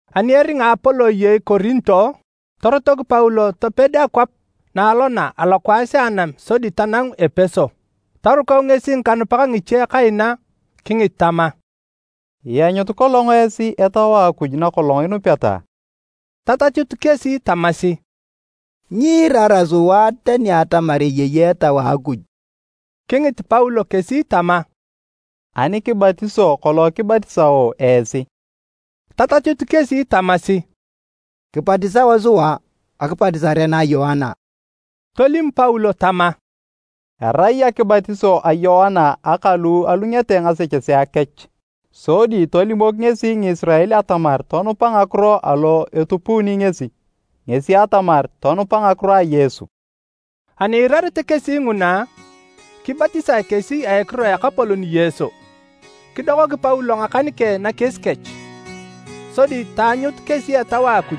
Ani eringa Apolo eyei Korinto, torotok Paulo toped akwap na alona alokwaas a anam sodi tanangu Epeso. Torukau ngesi ngikanupak ngiche kaina kingit tama, “Ianyut kolong esi Etau a Akuj na kolong inupeta?” Tatachut kesi tamasi, “Nyiirara sua tani atamar eyei Etau a Akuj.” Kingit Paulo kesi tama, “Ani kibatiso kolong kibatisao esi?” Tatachut kesi tamasi, “Kibatisao sua akibatisare na a Yoana.” Tolim Paulo tama, “Erai akibatiso a Yoana aka lu alungete ngasechesea kech. Sodi tolimok ngesi Ngisirael atamar tonupa ngakiro alo etupuuni ngesi, ngesi atamar, tonupa ngakiro a Yesu.” Ani iirarete kesi nguna, kibatisae kesi a ekiro a Ekapolon Yesu. Kidokok Paulo ngakan keng nakies kech, sodi taanyut kesi Etau a Akuj.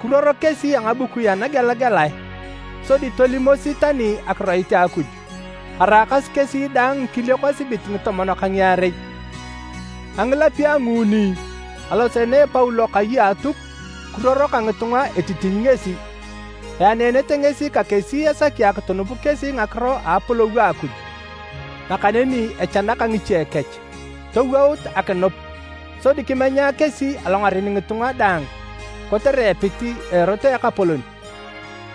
Kiruoro kesi a ngabukui anagelagelae. Sodi tolimosi tani akiroit a Akuj. Araakasi kesi daang ngikiliok esibit ngitomon ka ngiarei. A ngilapio a nguuni, aloseene Paulo kai a Atuk kiruoro ka ngitunga etitiny ngesi. Eaneenete ngesi ka kesi esaki akitunup kesi ngakiro a Apolou a Akuj. Nakaneni echanaka ngiche kech, towout akinup. Sodi kimenya kesi alongaren ngitunga daang kotere epit a Erot a Ekapolon.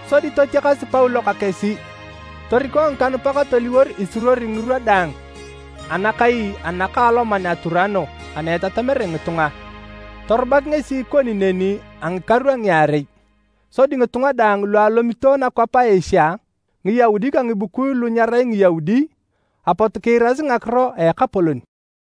Sodi totiakas Paulo ka kesi toriko ngikanupak toliwor isuruori ngirwa daang anakai anakaaloman a Turano ana etatamere ngitunga. Torubak ngesi ikoni neni a ngikaru a ngiarei. Sodi ngitunga daang lu alomito nakwap a Asia, Ngiyaudi ka ngibukui lu nyerai Ngiyaudi, apot kiirasi ngakiro a Ekapolon.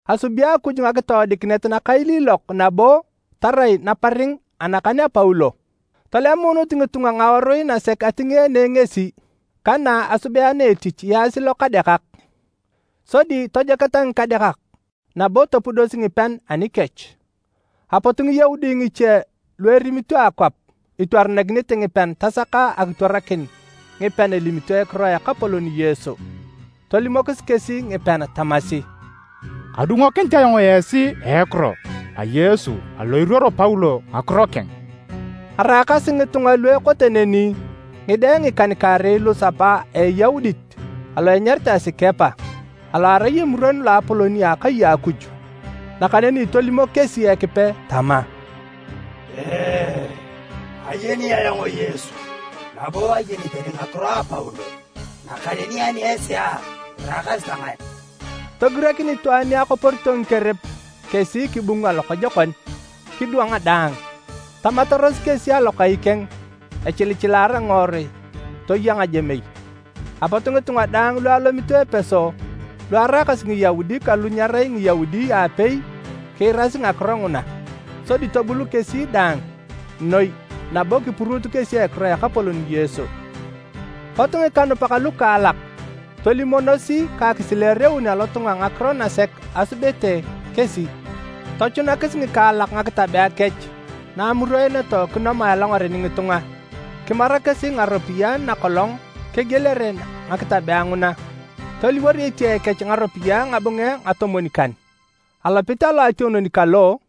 Asubi Akuj ngakitoodikinet nakailiilok nabo tarai naparing anakan a Paulo. Tolemuunut ngitunga ngawarui nasek atingeene ngesi ka na asubeenea etich yaasi lokadekak. Sodi tojoketa ngikadekak nabo topudosi ngipean anikech. Apot Ngiyaudi ngiche lu erimito akwap itwaranakinete ngipean tasaka akitwarakin ngipean elimito ekiro a Ekapolon Yesu. Tolimokis kesi ngipean tamasi, “Kadungokinit ayong esi a ekiro a Yesu alo iruoro Paulo ngakiro keng.” Araakasi ngitunga lu ekote neni ngide ngikan-kaarei lusapa a Eyaudit alo enyaritae Sikepa alo arai Emuron Loapolon a akai a Akuj. Nakaneni tolimok kesi Ekipe tama, “Ayeni ayong Yesu nabo ayeni tani ngakiro a Paulo, nakaneni ani esi a, iraakasi ta ngae?” Togirakin itwaan ni akoporito ngikerep kesi kibunga lokojokon, kidwang daang. Tamataros kesi alokai keng echilichilaara ngiworui toya ngajemei. Apot ngitunga daang lu alomito Epeso lu araakasi Ngiyaudi ka lu nyerai Ngiyaudi aapei kiirasi ngakiro nguna. Sodi tobul kesi daang noi nabo kipuruut kesi ekiro a Ekapolon Yesu. Pot ngikanupak lukaalak tolimonosi ka akisileereun alotunga ngakiro nasek asubete kesi. Tochunakis ngikaalak ngakitabea kech na amuroeneto kinomae alongaren ngitunga. Kimara kesi ngaropiyae na kolong kegielere ngakitabea nguna, toliwor etiae kech ngaropiyae ngabunge ngatomwon-kan. Alopit a loationon kalo,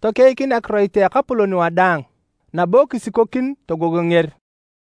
tokeikin akiroit a Ekapolon wadaang nabo kisikokin togogonger.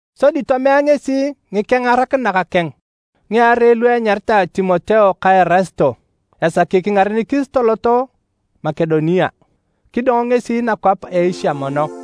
Sodi tomea ngesi ngikengarakinak keng ngiarei lu enyaritae Timoteo ka Erasito esaki kingarenikis toloto Makedonia. Kidong ngesi nakwap a Asia mono.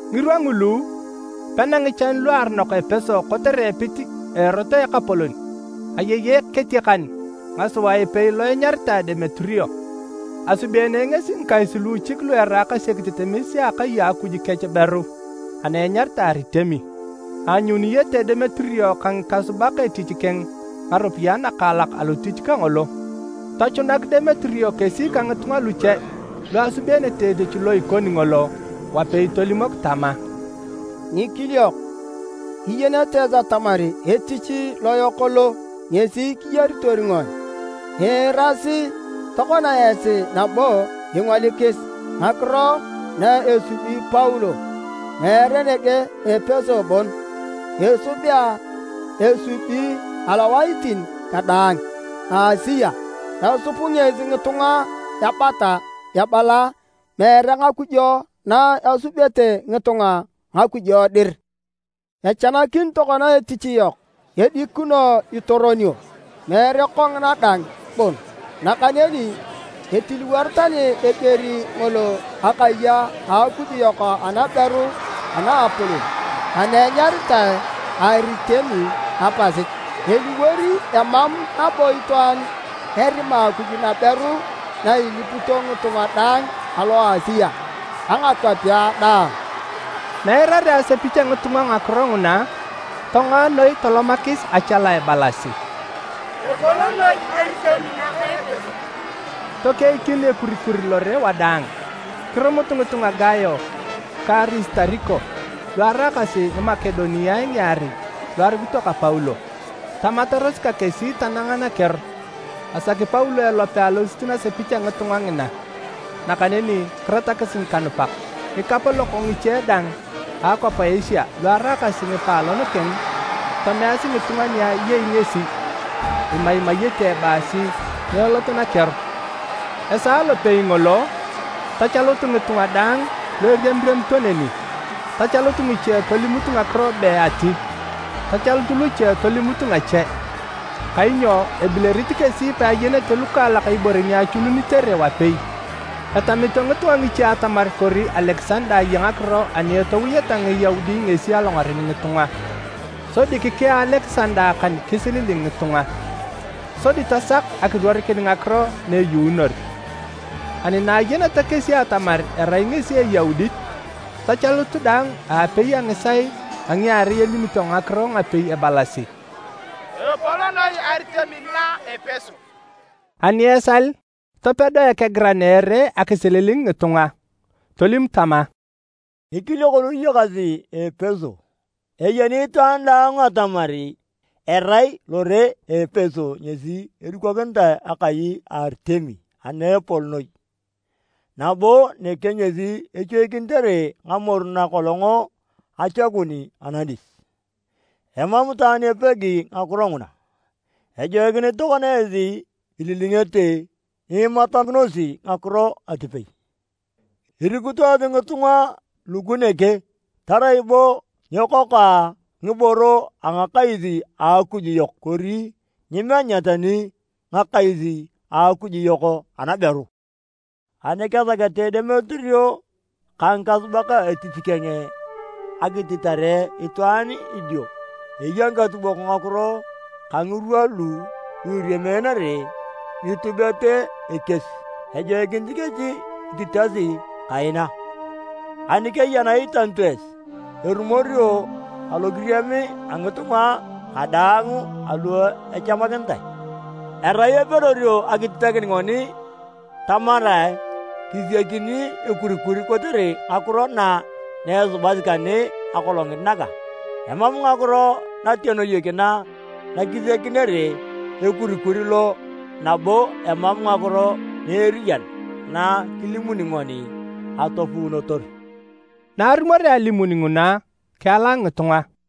Ngirwa ngulu, pena ngichan luaronok Epeso kotere epit a Erot alo a Ekapolon. Ayei eketiakan ngasua epei lo enyaritae Demeterio. Asubeene ngesi ngikais luuchik lu eraakasi ekitetemes a akai a Akuj kech beru ana enyaritae Aritemi. Aanyuniyete Demeterio ka ngikasubak etich keng ngaropiyae nakaalak alotich kangolo. Tochunak Demeterio kesi ka ngitunga luche lu asubeenete etich lo ikoni ngolo wapei tolimok tama, “Ngikiliok, iyenete esi atamar etich loyok lo ngesi kiyaritor ngoni. Iirasi tokona esi nabo ingolikis ngakiro na esubi Paulo. Meere nege Epeso bon esubea, esubi alowaitin kadaang a Asia. Esup ngesi ngitunga ebata ebala meere ngakujo na esubete ngitunga ngakujo dir. Echanakin tokona etich yok edikino itoronio. Meere kongina dang bon, nakaneni itiliwori tani eger ngolo akai a akuj yok anaberu anaapolon ana enyaritae Aritemi apasit. Eliwor emam nabo itwaan erima akuj naberu na ilipito ngitunga daang alo Asia ka ngakwapea daang!” Na eirarea asepich a ngitunga ngakiro nguna, tongoa noi tolomakis achala ebalasi, “Epol noi Aritemi naka Epeso!” Tokeikin ekurikur lore wadaang. Kirumut ngitunga Gayo ka Arisitariko lu araakasi Ngimakodeniae ngiarei lu arukito ka Paulo, tamataros ka kesi tananga nakeor. Asaki Paulo elope alosit nasepich a ngitunga ngina, nakaneni kiratakis ngikanupak. Ngikapolok ngiche dang a akwap a Asia lu araakasi ngipaalon keng, tomeasi ngitunga ni ayei ngesi imaimayete ebaasi nyeelot nakeor. Esaa lopei ngolo, tachalut ngitunga daang lu eriamiriamito neni, tachalut ngiche tolimut ngakiro be ati, tachalut luche tolimut ngache, kainyo ebilerit kesi peayenete lukaalak ibore ni achununitere wapei. Etamito ngitunga ngiche atamar kori Alekisanda aya ngakiro ani etowoeta Ngiyaudi ngesi alongaren ngitunga. Sodi kikea Alekisanda akan kisililing ngitunga, sodi tasak akiruorikin ngakiro na eyuunor. Ani na ayeneta kesi atamar erai ngesi Eyaudit, tachalut daang aapei a ngisaae a ngiarei elimito ngakiro ngapei ebalasi, “Epol noi Aritemi na a Epeso!” Ani esal, topedo ekegiran a ere akisililing ngitunga. Tolim tama, “Ngikiliok lu iyakasi Epeso! Eyeni itwaan daang atamar erai lore a Epeso ngesi edukokinitae akai ka Aritemi ana epol noi, nabo nege ngesi echoikinitere ngamoru na kolong achakun anadis. Emam itwaan epegi ngakiro nguna. Ejoikinit tokona esi ililingete nyiimatakinosi nakiro atipei. Irikut esi ngitunga lugu nege tarai bo nyekokoa ngiboro a ngakais a akuj yok kori nyiimenya tani ngakais a akuj yok anaberu. Ani kesakete Demeterio ka ngikasubak etich keng akititare itwaan idio eya ngikatubok ngakiro ka ngirwa lu iriameenere nitubet ekies. Ejoikinit kesi ititasi kaina. Ani keya na iitanito esi, erumorio alokiriam a ngitunga kadaang alo echamakinitae. Erai epedorio akititakin ngoni tamarae kisiakini ekurikur kotere ngakiro na asubasi kane akolongit naga. Emam ngakiro natenoyek na kisiakinere ekurikur lo nabo emam ngakiro na eriyan na kilimuni ngoni atopuunotor.” Na arumorea alimun nguna, kieala ngitunga.